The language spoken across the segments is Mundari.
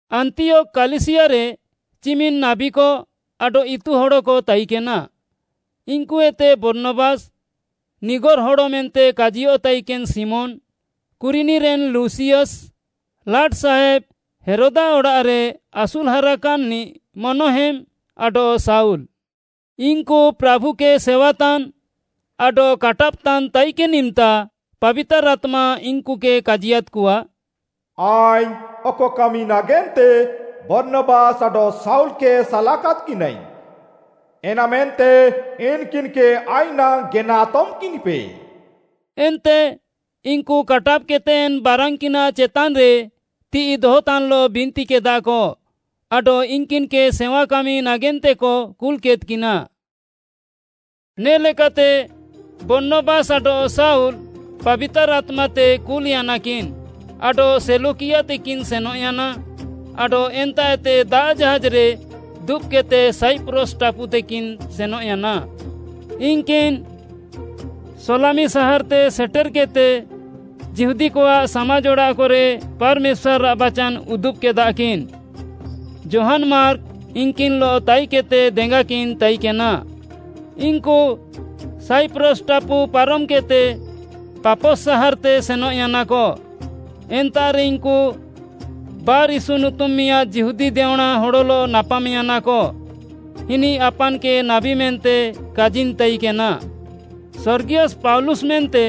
ଆନ୍ତିୟୋଖ୍‌ କାଲିସିୟାରେ ଚିମିନ୍‌ ନାବୀକ ଆଡଃ ଇତୁହଡ଼କ ତାଇକେନା, ଇନ୍‌କୁଏତେ ବର୍ଣ୍ଣବାସ୍‌, ନିଗର୍‌ ହଡ଼ ମେନ୍ତେ କାଜିୟଃ ତାଇକେନ୍‌ ଶିମୋନ୍‌, କୁରିନିରେନ୍‌ ଲୁସିୟସ୍‌, ଲାଟ୍‌ସାହେବ୍‌ ହେରୋଦ୍‌ଆଃ ଅଡ଼ାଃରେ ଆସୁଲ୍‌ହାରାକାନ୍‌ନିଃ ମନହେମ୍‌, ଆଡଃ ଶାଉଲ୍‌। ଇନ୍‌କୁ ପ୍ରାଭୁକେ ସେୱାତାନ୍‌ ଆଡଃ କାଟାବ୍‌ତାନ୍‍ ତାଇକେନ୍‌ ଇମ୍‌ତା ପାବିତାର୍‌ ଆତ୍ମା ଇନ୍‌କୁକେ କାଜିୟାଦ୍‍କଆ, “ଆଇଙ୍ଗ୍‌ ଅକ କାମି ନାଗେନ୍ତେ ବର୍ଣ୍ଣବାସ୍‌ ଆଡଃ ଶାଉଲ୍‌କେ ସାଲାକାଦ୍‌କିନାଇଙ୍ଗ୍‌, ଏନାମେନ୍ତେ ଇନ୍‌କିନ୍‌କେ ଆଇଁୟାଃ ନାଙ୍ଗ୍‌ ଗେନା ଆତମ୍‌କିନ୍‌ପେ।” ଏନ୍ତେ ଇନ୍‌କୁ କାଟାବ୍‌କେଦ୍‌ତେ ଏନ୍‌ ବାରାନ୍‌କିନାଃ ଚେତାନ୍‌ରେ ତିଃଇ ଦହତାନ୍‌ଲଃ ବିନ୍ତିକେଦାକ ଆଡଃ ଇନ୍‌କିନ୍‌କେ ସେୱାକାମି ନାଗେନ୍ତେକ କୁଲ୍‌କେଦ୍‌କିନା। ନେ'ଲେକାତେ ବର୍ଣ୍ଣବାସ୍‌ ଆଡଃ ଶାଉଲ୍‌ ପାବିତାର୍‌ ଆତ୍ମାତେ କୁଲ୍‌ୟାନାକିନ୍‌ ଆଡଃ ସେଲ୍ୟୁକିଆତେକିନ୍‌ ସେନଃୟାନା ଆଡଃ ଏନ୍ତାଃଏତେ ଦାଆଃ ଜାହାଜ୍‌ରେ ଦୁବ୍‌କେଦ୍‌ତେ ସାଇପ୍ରସ୍‌ ଟାପୁତେକିନ୍‌ ସେନଃୟାନା। ଇନ୍‌କିନ୍‌ ସଲାମି ସାହାର୍‌ତେ ସେଟେର୍‌କେଦ୍‌ତେ ଯିହୁଦୀକଆଃ ସାମାଜ୍‌ ଅଡ଼ାଃକରେ ପାର୍‌ମେଶ୍ୱାର୍‌ଆଃ ବାଚାନ୍‌ ଉଦୁବ୍‌କେଦାକିନ୍‌। ଯୋହାନ୍‌ ମାର୍କ ଇନ୍‌କିନ୍‌ଲଃ ତାଇକେଦ୍‌ତେ ଦେଙ୍ଗାକିନ୍‌ ତାଇକେନା। ଇନ୍‌କୁ ସାଇପ୍ରସ୍‌ ଟାପୁ ପାରମ୍‌କେଦ୍‌ତେ ପାଫସ୍‌ ସାହାର୍‌ତେ ସେନଃୟାନାକ। ଏନ୍ତାଃରେ ଇନ୍‌କୁ ବାର୍‌ୟୀଶୁ ନୁତୁମ୍‌ ମିଆଁଦ୍‌ ଯିହୁଦୀ ଦେଅଁଣା ହଡ଼ଲଃ ନାପାମ୍‌ୟାନାକ। ଇନିଃ ଆପାନ୍‌କେ ନାବୀ ମେନ୍ତେ କାଜିନ୍‌ ତାଇକେନା। ସର୍ଗିୟସ୍‌ ପାଉଲୁସ୍‌ ମେନ୍ତେ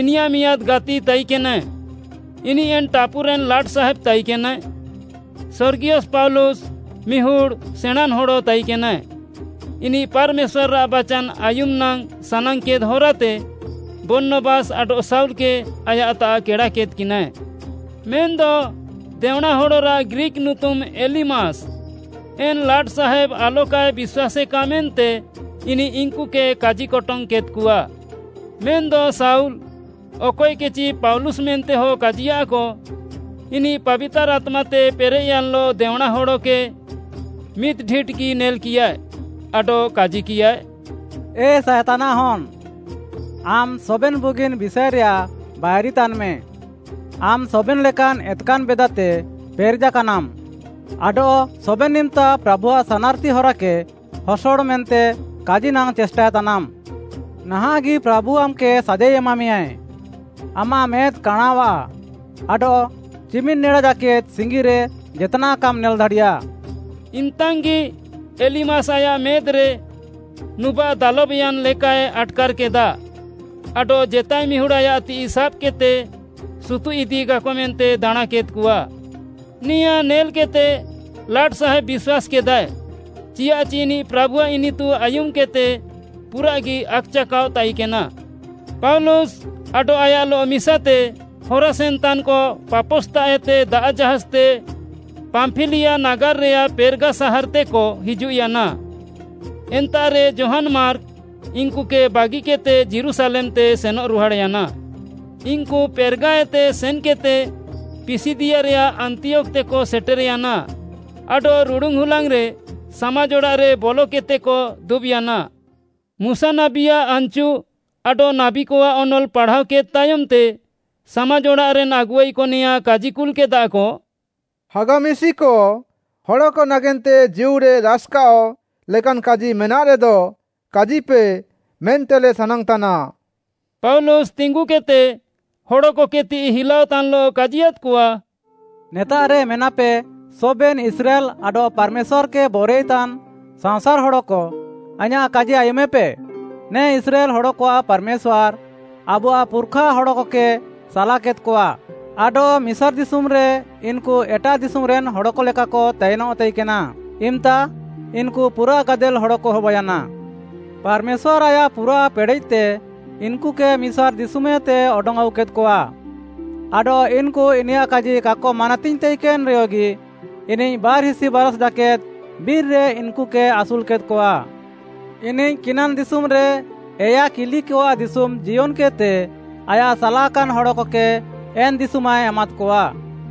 ଇନିୟାଃ ମିଆଁଦ୍‌ ଗାତି ତାଇକେନାଏ, ଇନିଃ ଏନ୍‌ ଟାପୁରେନ୍‌ ଲାଟ୍‌ସାହେବ୍‌ ତାଇକେନାଏ। ସର୍ଗିୟସ୍‌ ପାଉଲୁସ୍‌ ମିହୁଡ଼୍‌ ସେଣାଁନ୍‌ ହଡ଼ ତାଇକେନାଏ। ଇନିଃ ପାର୍‌ମେଶ୍ୱାର୍‌ଆଃ ବାଚାନ୍‌ ଆୟୁମ୍‌ ନାଙ୍ଗ୍‌ ସାନାଙ୍ଗ୍‌କେଦ୍‌ ହରାତେ ବର୍ଣ୍ଣବାସ୍‌ ଆଡଃ ଶାଉଲ୍‌କେ ଆୟାଃତାଃ କେଡ଼ାକେଦ୍‌କିନାଏ। ମେନ୍‌ଦ ଦେଅଁଣାହଡ଼ରାଃ ଗ୍ରୀକ୍‌ ନୁତୁମ୍‌ ଏଲିମାସ୍‌, ଏନ୍‌ ଲାଟ୍‌ସାହେବ୍‌ ଆଲକାଏ ବିଶ୍ୱାସେକା ମେନ୍ତେ ଇନିଃ ଇନ୍‌କୁକେ କାଜିକଟଙ୍ଗ୍‌ କେଦ୍‌କଆ। ମେନ୍‌ଦ ଶାଉଲ୍‌, ଅକଏକେଚି ପାଉଲୁସ୍‌ ମେନ୍ତେହ କାଜିୟାଃକ, ଇନିଃ ପାବିତାର୍‌ ଆତ୍ମାତେ ପେରେଃୟାନ୍‌ଲଃ ଦେଅଁଣାହଡ଼କେ ମିଦ୍‌ଢିଟ୍‌ଗି ନେଲ୍‌କିୟାଏ, ଆଡଃ କାଜିକିୟାଏ, “ଏ ସାଏତାନ୍‌ଆଃ ହନ୍‌, ଆମ୍‌ ସବେନ୍‌ ବୁଗିନ୍‌ ବିଷାଏରେୟାଃ ବାଇରିତାନ୍‌ମେ। ଆମ୍‌ ସବେନ୍‌ ଲେକାନ୍‌ ଏତ୍‌କାନ୍‌ ବେଦାତେ ପେରେଜାକାନାମ୍‌ ଆଡଃ ସବେନ୍‌ ଇମ୍‌ତା ପ୍ରାଭୁଆଃ ସାନାର୍‌ତି ହରାକେ ହସଡ଼ ମେନ୍ତେ କାଜି ନାଙ୍ଗ୍‌ ଚେଷ୍ଟାଏ ତାନାମ୍‌। ନାହାଁଃଗି ପ୍ରାଭୁ ଆମ୍‌କେ ସାଜାଇ ଏମାମେୟାଁଏ, ଆମାଃ ମେଦ୍‌ କାଣାଁଅଃଆ ଆଡଃ ଚିମିନ୍‌ ନେଡା ଜାକେଦ୍‌ ସିଙ୍ଗିରେ ଜେତ୍‌ନାଃ କାମ୍‌ ନେଲ୍‌ ଦାଡ଼ିୟା।” ଇମ୍‌ତାଙ୍ଗି ଏଲିମାସ୍‌ ଆୟାଃ ମେଦ୍‌ରେ ନୁବାଃ ଦାଲବ୍‌ୟାନ୍‌ ଲେକାଏ ଆଟ୍‌କାର୍‌କେଦା ଆଡଃ ଜେତାଏ ମିହୁଡ଼୍‌ ଆୟାଃ ତିଃଇ ସାବ୍‌କେଦ୍‌ତେ ସୁତୁଃଇଦିକାକ ମେନ୍ତେ ଦାଣାଁକେଦ୍‌କଆ। ନେଆଁ ନେଲ୍‌କେଦ୍‌ତେ ଲାଟ୍‌ସାହେବ୍‌ ବିଶ୍ୱାସ୍‌କେଦାଏ, ଚିଆଃଚି ଇନିଃ ପ୍ରାଭୁଆଃ ଇନିତୁ ଆୟୁମ୍‌କେଦ୍‌ତେ ପୁରାଃଗି ଆକ୍‌ଚାକାଅଃ ତାଇକେନା। ପାଉଲୁସ୍‌ ଆଡଃ ଆୟାଃଲଃ ମିସାତେ ହରାସେନ୍‌ତାନ୍‌କ ପାଫସ୍‌ତାଃଏତେ ଦାଆଃ ଜାହାଜ୍‌ତେ ପାମ୍ପିଲିଆ ନାଗାର୍‌ରେୟାଃ ପେର୍‌ଗା ସାହାର୍‌ତେକ ହିଜୁଃୟାନା, ଏନ୍ତାଃରେ ଯୋହାନ୍‌ ମାର୍କ ଇନ୍‌କୁକେ ବାଗିକେଦ୍‌ତେ ଯୀରୁଶାଲେମ୍‌ତେ ସେନଃରୁହାଡ଼୍‌ୟାନା। ଇନ୍‌କୁ ପେର୍‌ଗାଏତେ ସେନ୍‌କେଦ୍‌ତେ ପିସିଦିଆରେୟାଃ ଆନ୍ତିୟୋଖ୍‌ତେକ ସେଟେର୍‌ୟାନା ଆଡଃ ରୁଡ଼ୁନ୍‌ ହୁଲାଙ୍ଗ୍‌ରେ ସାମାଜ୍‌ ଅଡ଼ାଃରେ ବଲକେଦ୍‌ତେକ ଦୁବ୍‌ୟାନା। ମୁଶା ନାବୀଆଃ ଆନ୍‌ଚୁ ଆଡଃ ନାବୀକଆଃ ଅନଲ୍‌ ପାଢ଼ାଅକେଦ୍‌ ତାୟମ୍‌ତେ, ସାମାଜ୍‌ଅଡ଼ାଃରେନ୍‌ ଆଗୁଆଇକ ନେଆଁ କାଜିକୁଲ୍‌କେଦାକ, “ହାଗା ମିଶିକ, ହଡ଼କ ନାଗେନ୍ତେ ଜୀଉରେ ରାସ୍‌କାଅଃ ଲେକାନ୍‌ କାଜି ମେନାଃରେଦ, କାଜିପେ ମେନ୍ତେଲେ ସାନାଙ୍ଗ୍‌ତାନା।” ପାଉଲୁସ୍‌ ତିଙ୍ଗୁକେଦ୍‌ତେ, ହଡ଼କକେ ତିଃଇ ହିଲାଅତାନ୍‌ଲଃ କାଜିୟାଦ୍‌କଆ, “ନେତାଃରେ ମେନାପେ ସବେନ୍‌ ଇସ୍ରାଏଲ୍‌ ଆଡଃ ପାର୍‌ମେଶ୍ୱାର୍‌କେ ବରୱାଇତାନ୍‌ ସାଅଁସାର୍‌ ହଡ଼କ, ଆଇଁୟାଃ କାଜି ଆୟୁମେପେ, ନେ ଇସ୍ରାଏଲ୍‌ ହଡ଼କଆଃ ପାର୍‌ମେଶ୍ୱାର୍‌ ଆବୁଆଃ ପୁର୍‌ଖା ହଡ଼କକେ ସାଲାକେଦ୍‌କଆ ଆଡଃ ମିସାର୍‌ ଦିଶୁମ୍‌ରେ ଇନ୍‌କୁ ଏଟାଃ ଦିଶୁମ୍‌ରେନ୍‌ ହଡ଼କ ଲେକାକ ତାଇନଃ ତାଇକେନା, ଇମ୍‌ତା ଇନ୍‌କୁ ପୁରାଃ ଗାଦେଲ୍‌ ହଡ଼କ ହବାୟାନା। ପାର୍‌ମେଶ୍ୱାର୍‌ ଆୟାଃ ପୁରାଃ ପେଡ଼େଃତେ ଇନ୍‌କୁକେ ମିସାର୍‌ ଦିଶୁମ୍‌ହେତେ ଅଡଙ୍ଗ୍‌ ଆଉକେଦ୍‌କଆ, ଆଡଃ ଇନ୍‌କୁ ଇନିୟାଃ କାଜି କାକ ମାନାତିଙ୍ଗ୍‌ ତାଇକେନ୍‌ରେୟଗି, ଇନିଃ ବାର୍‌ହିସି ବାରାଷ୍‌ ଜାକେଦ୍‌ ବିର୍‌ରେ ଇନ୍‌କୁକେ ଆସୁଲ୍‌କେଦ୍‌କଆ। ଇନିଃ କିନାନ୍‌ ଦିଶୁମ୍‌ରେ ଏୟା କିଲିକଆଃ ଦିଶୁମ୍‌ ଜିୟନ୍‌କେଦ୍‌ତେ ଆୟାଃ ସାଲାକାନ୍‌ ହଡ଼କକେ ଏନ୍‌ ଦିଶୁମାଏ ଏମାଦ୍‌କଆ।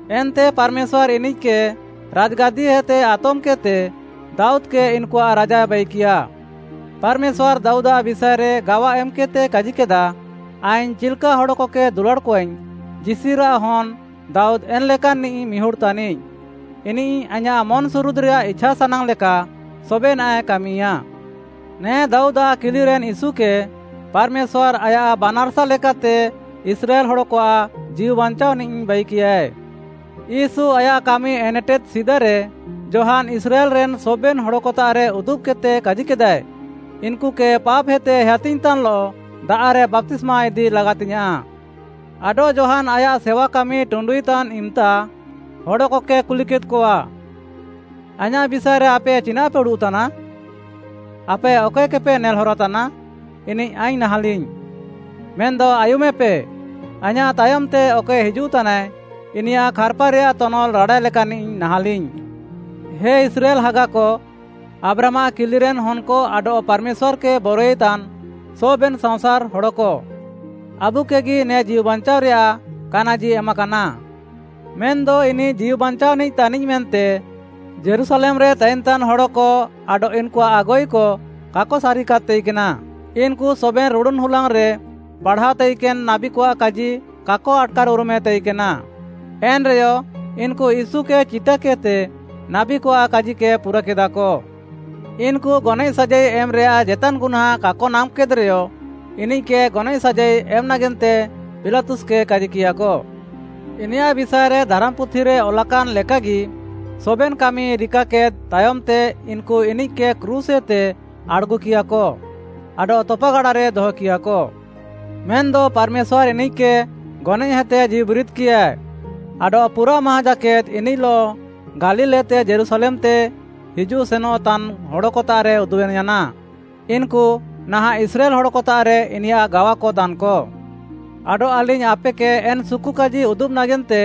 ଏନ୍ତେ ପାର୍‌ମେଶ୍ୱାର୍‌ ଇନିଃକେ ରାଜ୍‌ଗାଦିହେତେ ଆତମ୍‌କେଦ୍‌ତେ, ଦାଉଦ୍‌କେ ଇନ୍‌କୁଆଃ ରାଜାଏ ବାଇକିୟା। ପାର୍‌ମେଶ୍ୱାର୍‌ ଦାଉଦ୍‌ଆଃ ବିଷାଏରେ ଗାୱା ଏମ୍‌କେଦ୍‌ତେ କାଜିକେଦା, ‘ଆଇଙ୍ଗ୍‌ ଚିଲ୍‌କା ହଡ଼କକେ ଦୁଲାଡ଼୍‌କଆଇଙ୍ଗ୍‌, ଯିଶିରାଃ ହନ୍‌ ଦାଉଦ୍‌ ଏନ୍‌ଲେକାନ୍‌ନିଃ ମିହୁଡ଼୍‌ ତାନିଃ। ଇନିଃ ଆଇଁୟାଃ ମନ୍‌ସୁରୁଦ୍‌ରେୟାଃ ଇଛାସାନାଙ୍ଗ୍‌ ଲେକା ସବେନାଃଏ କାମିୟା।’ ନେ ଦାଉଦାଃ କିଲିରେନ୍‌ ୟୀଶୁକେ ପାର୍‌ମେଶ୍ୱାର୍‌ ଆୟାଃ ବାନାର୍‌ସା ଲେକାତେ ଇସ୍ରାଏଲ୍‌ ହଡ଼କଆଃ ଜୀଉବାଞ୍ଚାଅନିଃ ବାଇକିୟାଏ। ୟୀଶୁ ଆୟାଃ କାମି ଏନେଟେଦ୍‌ ସିଦାରେ ଯୋହାନ୍‌ ଇସ୍ରାଏଲ୍‌ରେନ୍‌ ସବେନ୍‌ ହଡ଼କତାଃରେ ଉଦୁବ୍‌କେଦ୍‌ତେ କାଜିକେଦାଏ, ‘ଇନ୍‌କୁକେ ପାପ୍‌ହେତେ ହେୟାତିଙ୍ଗ୍‌ତାନ୍‌ଲଃ ଦାଆଃରେ ବାପ୍ତିସ୍ମା ଇଦି ଲାଗାତିଙ୍ଗ୍‌ୟାଁଃ।’ ଆଡଃ ଯୋହାନ୍‌ ଆୟାଃ ସେୱାକାମି ଟୁଣ୍ଡୁଇତାନ୍‌ ଇମ୍‌ତା ହଡ଼କକେ କୁଲିକେଦ୍‌କଆ, ‘ଆଇଁୟାଃ ବିଷାଏରେ ଆପେ ଚିନାଃପେ ଉଡ଼ୁଃତାନା? ଆପେ ଅକଏକେପେ ନେଲ୍‌ହରାତାନା, ଇନିଃ ଆଇଙ୍ଗ୍‌ ନାହାଁଲିଙ୍ଗ୍‌। ମେନ୍‌ଦ ଆୟୁମେପେ, ଆଇଁୟାଃ ତାୟମ୍‌ତେ ଅକଏ ହିଜୁଃତାନାଏ, ଇନିୟାଃ ଖାର୍‌ପାରେୟାଃ ତନଲ୍‌ ରାଡ଼ାଏ ଲେକାନ୍‌ନିଃ ନାହାଁଲିଙ୍ଗ୍‌।’ “ହେ ଇସ୍ରାଏଲ୍‌ ହାଗାକ, ଆବ୍ରାହାମ୍‌ଆଃ କିଲିରେନ୍‌ ହନ୍‌କ ଆଡଃ ପାର୍‌ମେଶ୍ୱାର୍‌କେ ବରୱାଇତାନ୍‌ ସବେନ୍‌ ସାଅଁସାର୍‌ ହଡ଼କ, ଆବୁକେଗି ନେ ଜୀଉବାଞ୍ଚାଅରେୟାଃ କାନାଜି ଏମାକାନା। ମେନ୍‌ଦ ଇନିଃ ଜୀଉବାଞ୍ଚାଅନିଃ ତାନିଃ ମେନ୍ତେ ଯୀରୁଶାଲେମ୍‌ରେ ତାଇନ୍‌ତାନ୍‌ ହଡ଼କ ଆଡଃ ଇନ୍‌କୁଆଃ ଆଗୁଆଇକ କାକ ସାରିକାଦ୍‌ ତାଇକେନା। ଇନ୍‌କୁ ସବେନ୍‌ ରୁଡ଼ୁନ୍‌ ହୁଲାଙ୍ଗ୍‌ରେ ପାଢ଼ାଅଃ ତାଇକେନ୍‌ ନାବୀକଆଃ କାଜି କାକ ଆଟ୍‌କାର୍‌ଉରୁମେ ତାଇକେନା। ଏନ୍‌ରେୟ ଇନ୍‌କୁ ୟୀଶୁକେ ଚିଟାକେଦ୍‌ତେ ନାବୀକଆଃ କାଜିକେ ପୁରାକେଦାକ। ଇନ୍‌କୁ ଗନଏଃ ସାଜାଇ ଏମ୍‌ରେୟାଃ ଜେତାନ୍‌ ଗୁହ୍ନାଁ କାକ ନାମ୍‌କେଦ୍‌ରେୟ, ଇନିଃକେ ଗନଏଃ ସାଜାଇ ଏମ୍‌ ନାଗେନ୍ତେ ପିଲାତୁସ୍‌କେ କାଜିକିୟାକ। ଇନିୟାଃ ବିଷାଏରେ ଧାରାମ୍‌ପୁଥିରେ ଅଲାକାନ୍‌ ଲେକାଗି ସବେନ୍‌ କାମି ରିକାକେଦ୍‌ ତାୟମ୍‌ତେ ଇନ୍‌କୁ ଇନିଃକେ କ୍ରୁଶ୍‌ଏତେ ଆଡ଼୍‌ଗୁକିୟାକ ଆଡଃ ତପାଗାଡ଼ାରେ ଦହକିୟାକ। ମେନ୍‌ଦ ପାର୍‌ମେଶ୍ୱାର୍‌ ଇନିଃକେ ଗନଏଃହେତେ ଜୀଉବିରିଦ୍‌କିୟା, ଆଡଃ ପୁରାଃ ମାହାଁ ଜାକେଦ୍‌ ଇନିଃଲଃ ଗାଲିଲ୍‌ଏତେ ଯୀରୁଶାଲେମ୍‌ତେ ହିଜୁଃ ସେନଃତାନ୍‌ ହଡ଼କତାଃରେ ଉଦୁବେନ୍‌ୟାନା। ଇନ୍‌କୁ ନାହାଁଃ ଇସ୍ରାଏଲ୍‌ ହଡ଼କତାଃରେ ଇନିୟାଃ ଗାୱାକ ତାନ୍‌କ। ଆଡଃ ଆଲିଙ୍ଗ୍‌ ଆପେକେ ଏନ୍‌ ସୁକୁକାଜି ଉଦୁବ୍‌ ନାଗେନ୍ତେ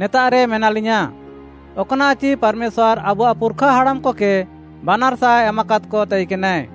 ନେତାଃରେ ମେନାଲିୟାଁ, ଅକ୍‌ନାଃଚି ପାର୍‌ମେଶ୍ୱାର୍‌ ଆବୁଆଃ ପୁର୍‌ଖା ହାଡ଼ାମ୍‌ହଡ଼କକେ ବାନାର୍‌ସା ଏମାକାଦ୍‌କ ତାଇକେନାଏ,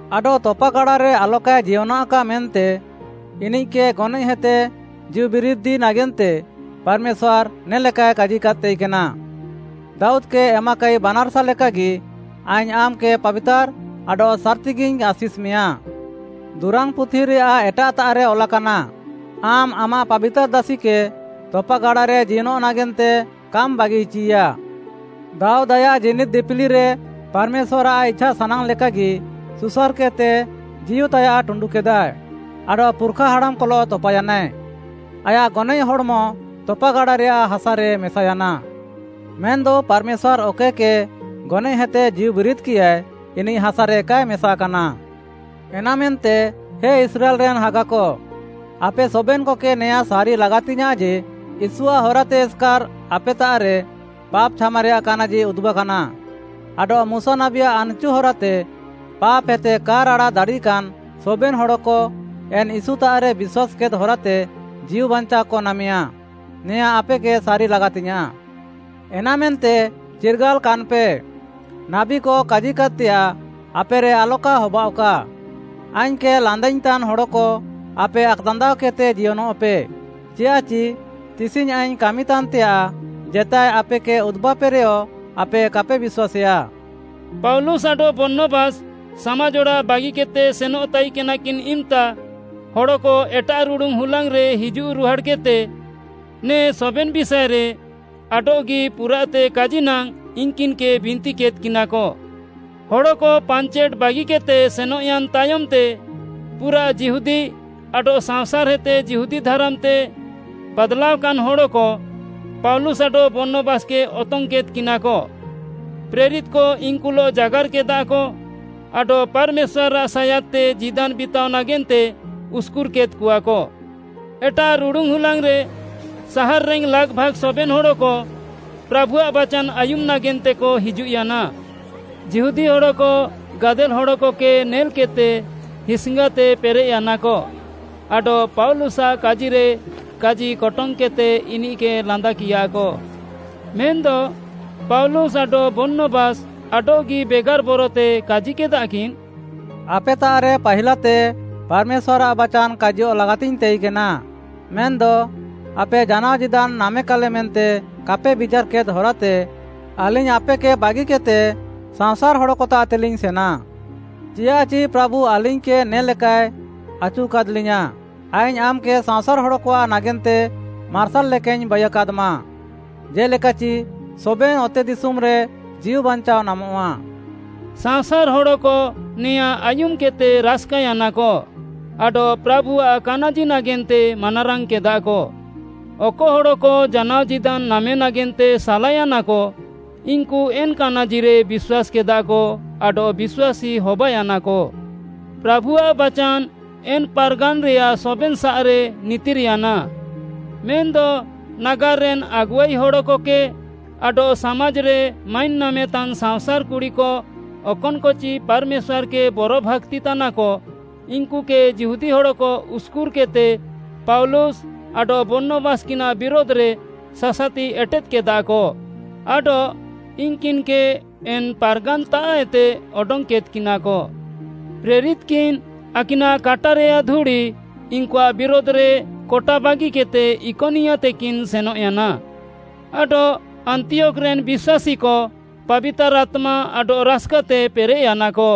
ଆଡଃ ତପାଗାଡ଼ାରେ ଆଲକାଏ ଜିୟନଃକା ମେନ୍ତେ ଇନିଃକେ ଗନଏଃହେତେ ଜୀଉବିରିଦି ନାଗେନ୍ତେ ପାର୍‌ମେଶ୍ୱାର୍‌ ନେ'ଲେକାଏ କାଜିକାଦ୍‌ ତାଇକେନା, ‘ଦାଉଦ୍‌କେ ଏମାକାଇ ବାନାର୍‌ସା ଲେକାଗି ଆଇଙ୍ଗ୍‌ ଆମ୍‌କେ ପାବିତାର୍‌ ଆଡଃ ସାର୍‍ତିଗିଇଙ୍ଗ୍‌ ଆଶିଷ୍‌ମେୟାଁ।’ ଦୁରାଙ୍ଗ୍‌ପୁଥିରେୟାଃ ଏଟାଃତାଃରେ ଅଲାକାନା, ‘ଆମ୍‌ ଆମାଃ ପାବିତାର୍‌ ଦାସିକେ ତପାଗାଡ଼ାରେ ଜିୟନଃ ନାଗେନ୍ତେ କାମ୍‌ ବାଗିଇଚିୟା।’” ଦାଉଦ୍‌ ଆୟାଃ ଜୀନିଦ୍‌ ଦିପିଲିରେ ପାର୍‌ମେଶ୍ୱାର୍‌ଆଃ ଇଛାସାନାଙ୍ଗ୍‌ ଲେକାଗି, ସୁସାର୍‌କେଦ୍‌ତେ ଜୀଉତାୟାଃ ଟୁଣ୍ଡୁକେଦା ଆଡଃ ପୁର୍‌ଖା ହାଡ଼ାମ୍‌କଲଃ ତପାୟାନାଏ। ଆୟାଃ ଗନଏଃ ହଡ଼୍‌ମ ତପାଗାଡ଼ାରେୟାଃ ହାସାରେ ମେସାୟାନା। ମେନ୍‌ଦ ପାର୍‌ମେଶ୍ୱାର୍‌ ଅକଏକେ ଗନଏଃହେତେ ଜୀଉବିରିଦ୍‌କିୟାଏ, ଇନିଃ ହାସାରେ କାଏ ମେସାକାନା। ଏନାମେନ୍ତେ, ହେ ଇସ୍ରାଏଲ୍‌ରେନ୍‌ ହାଗାକ, ଆପେ ସବେନ୍‌କକେ ନେଆଁ ସାରି ଲାଗାତିଙ୍ଗ୍‌ୟାଁଃ ଯେ, ୟୀଶୁଆଃ ହରାତେ ଏସ୍‌କାର୍‌ ଆପେତାଃରେ ପାପ୍‌ ଛାମାରେୟାଃ କାନାଜି ଉଦୁବ୍‌କାନା। ଆଡଃ ମୁଶା ନାବୀଆଃ ଆନ୍‌ଚୁ ହରାତେ ପାପ୍‌ହେତେ କା ରାଡ଼ା ଦାଡ଼ିକାନ୍‌ ସବେନ୍‌ ହଡ଼କ, ଏନ୍‌ ୟୀଶୁତାଃରେ ବିଶ୍ୱାସ୍‌କେଦ୍‌ ହରାତେ ଜୀଉବାଞ୍ଚାଅକ ନାମେୟା, ନେଆଁ ଆପେକେ ସାରି ଲାଗାତିଙ୍ଗ୍‌ୟାଁଃ। ଏନାମେନ୍ତେ ଚିର୍ଗାଲ୍‌କାନ୍‌ପେ, ନାବୀକ କାଜିକାଦ୍‌ତେୟାଃ ଆପେରେ ଆଲକା ହବାଅଃକା, “‘ଆଇଙ୍ଗ୍‌କେ ଲାନ୍ଦାଇଙ୍ଗ୍‌ତାନ୍‌ ହଡ଼କ, ଆପେ ଆକ୍‌ଦାନ୍ଦାଅକେଦ୍‌ତେ ଜିୟନଃପେ, ଚିଆଃଚି ତିସିଙ୍ଗ୍‌ ଆଇଙ୍ଗ୍‌ କାମିତାନ୍‌ତେୟାଃ, ଜେତାଏ ଆପେକେ ଉଦୁବାପେରେୟ ଆପେ କାପେ ବିଶ୍ୱାସେୟା।’” ପାଉଲୁସ୍‌ ଆଡଃ ବର୍ଣ୍ଣବାସ୍‌ ସାମାଜ୍‌ ଅଡ଼ାଃ ବାଗିକେଦ୍‌ତେ ସେନଃ ତାଇକେନାକିନ୍‌ ଇମ୍‌ତା, ହଡ଼କ ଏଟାଃ ରୁଡ଼ୁନ୍‌ ହୁଲାଙ୍ଗ୍‌ରେ ହିଜୁଃ ରୁହାଡ଼୍‌କେଦ୍‌ତେ ନେ ସବେନ୍‌ ବିଷାଏରେ ଆଡଃଗି ପୁରାଃତେ କାଜି ନାଙ୍ଗ୍‌ ଇନ୍‌କିନ୍‌କେ ବିନ୍ତିକେଦ୍‌କିନାକ। ହଡ଼କ ପାଞ୍ଚେଟ୍‌ ବାଗିକେଦ୍‌ତେ ସେନଃୟାନ୍‌ ତାୟମ୍‌ତେ, ପୁରାଃ ଯିହୁଦୀ ଆଡଃ ସାଅଁସାର୍‌ହେତେ ଯିହୁଦୀ ଧାରାମ୍‌ତେ ବାଦ୍‌ଲାଅକାନ୍‌ ହଡ଼କ, ପାଉଲୁସ୍‌ ଆଡଃ ବର୍ଣ୍ଣବାସ୍‌କେ ଅତଙ୍ଗ୍‌କେଦ୍‌କିନାକ। ପ୍ରେରିତ୍‌କ ଇନ୍‌କୁଲଃ ଜାଗାର୍‌କେଦାକ ଆଡଃ ପାର୍‌ମେଶ୍ୱାର୍‌ଆଃ ସାୟାଦ୍‌ତେ ଜୀଦାନ୍‌ ବିତାଅ ନାଗେନ୍ତେ ଉସ୍‍କୁର୍‍କେଦ୍‌କଆକ। ଏଟାଃ ରୁଡ଼ୁନ୍‌ ହୁଲାଙ୍ଗ୍‌ରେ, ସାହାର୍‌ରେନ୍‌ ଲାଗ୍‌ଭାଗ୍‌ ସବେନ୍‌ ହଡ଼କ ପ୍ରାଭୁଆଃ ବାଚାନ୍‌ ଆୟୁମ୍‌ ନାଗେନ୍ତେକ ହିଜୁଃୟାନା। ଯିହୁଦୀ ହଡ଼କ ଗାଦେଲ୍‌ ହଡ଼କକେ ନେଲ୍‌କେଦ୍‌ତେ ହିସ୍‌ଙ୍ଗାତେ ପେରେଃୟାନାକ ଆଡଃ ପାଉଲୁସ୍‌ଆଃ କାଜିରେ କାଜିକଟଙ୍ଗ୍‌କେଦ୍‌ତେ ଇନିଃକେ ଲାନ୍ଦାକିୟାକ। ମେନ୍‌ଦ ପାଉଲୁସ୍‌ ଆଡଃ ବର୍ଣ୍ଣବାସ୍‌ ଆଡଃଗି ବେଗାର୍‌ ବରତେ କାଜିକେଦାକିନ୍‌, “ଆପେତାଃରେ ପାହିଲାତେ ପାର୍‌ମେଶ୍ୱାର୍‌ଆଃ ବାଚାନ୍‌ କାଜିୟଃ ଲାଗାତିଙ୍ଗ୍‌ ତାଇକେନା। ମେନ୍‌ଦ ଆପେ ଜାନାଅ ଜୀଦାନ୍‌ ନାମେକାଲେ ମେନ୍ତେ କାପେ ବିଚାର୍‌କେଦ୍‌ ହରାତେ, ଆଲିଙ୍ଗ୍‌ ଆପେକେ ବାଗିକେଦ୍‌ତେ ସାଅଁସାର୍‌ ହଡ଼କତାଃତେଲିଙ୍ଗ୍‌ ସେନା। ଚିଆଃଚି ପ୍ରାଭୁ ଆଲିଙ୍ଗ୍‌କେ ନେ ଲେକାଏ ଆଚୁକାଦ୍‌ଲିୟାଁ, “‘ଆଇଙ୍ଗ୍‌ ଆମ୍‌କେ ସାଅଁସାର୍‌ ହଡ଼କଆଃ ନାଗେନ୍ତେ ମାର୍ସାଲ୍‌ ଲେକାଇଙ୍ଗ୍‌ ବାଇୟାକାଦ୍‌ମା, ଜେ'ଲେକାଚି ସବେନ୍‌ ଅତେଦିଶୁମ୍‌ରେ ଜୀଉବାଞ୍ଚାଅ ନାମଃଆ।’” ସାଅଁସାର୍‌ ହଡ଼କ ନେଆଁ ଆୟୁମ୍‌କେଦ୍‌ତେ ରାସ୍‌କାୟାନାକ ଆଡଃ ପ୍ରାଭୁଆଃ କାନାଜି ନାଗେନ୍ତେ ମାନାରାଙ୍ଗ୍‌କେଦାକ। ଅକ ହଡ଼କ ଜାନାଅ ଜୀଦାନ୍‌ ନାମେ ନାଗେନ୍ତେ ସାଲାୟାନାକ, ଇନ୍‌କୁ ଏନ୍‌ କାନାଜିରେ ବିଶ୍ୱାସ୍‌କେଦାକ ଆଡଃ ବିଶ୍ୱାସୀ ହବାୟାନାକ। ପ୍ରାଭୁଆଃ ବାଚାନ୍‌ ଏନ୍‌ ପାର୍‌ଗାନ୍‌ରେୟାଃ ସବେନ୍‌ସାଃରେ ନିତିର୍‌ୟାନା। ମେନ୍‌ଦ ନାଗାର୍‌ରେନ୍‌ ଆଗୁଆଇ ହଡ଼କକେ ଆଡଃ ସାମାଜ୍‌ରେ ମାଇନ୍‌ ନାମେତାନ୍‌ ସାଅଁସାର୍‌ କୁଡ଼ିକ, ଅକନ୍‌କଚି ପାର୍‌ମେଶ୍ୱାର୍‌କେ ବରଭାକ୍ତିତାନାକ, ଇନ୍‌କୁକେ ଯିହୁଦୀ ହଡ଼କ ଉସ୍‌କୁର୍‌କେଦ୍‌ତେ ପାଉଲୁସ୍‌ ଆଡଃ ବର୍ଣ୍ଣବାସ୍‌କିନାଃ ବିରୁଧ୍‌ରେ ସାସାତି ଏଟେଦ୍‌କେଦାକ ଆଡଃ ଇନ୍‌କିନ୍‌କେ ଏନ୍‌ ପାର୍‌ଗାନ୍‌ତାଃଏତେ ଅଡଙ୍ଗ୍‌କେଦ୍‌କିନାକ। ପ୍ରେରିତ୍‌କିନ୍‌ ଆକିନାଃ କାଟାରେୟାଃ ଧୁଡ଼ି ଇନ୍‌କୁଆଃ ବିରୁଧ୍‌ରେ କଟାବାଗିକେଦ୍‌ତେ ଇକନିୟାତେକିନ୍‌ ସେନଃୟାନା। ଆଡଃ ଆନ୍ତିୟୋଖ୍‌ରେନ୍‌ ବିଶ୍ୱାସୀକ ପାବିତାର୍‌ ଆତ୍ମା ଆଡଃ ରାସ୍‌କାତେ ପେରେଃୟାନାକ।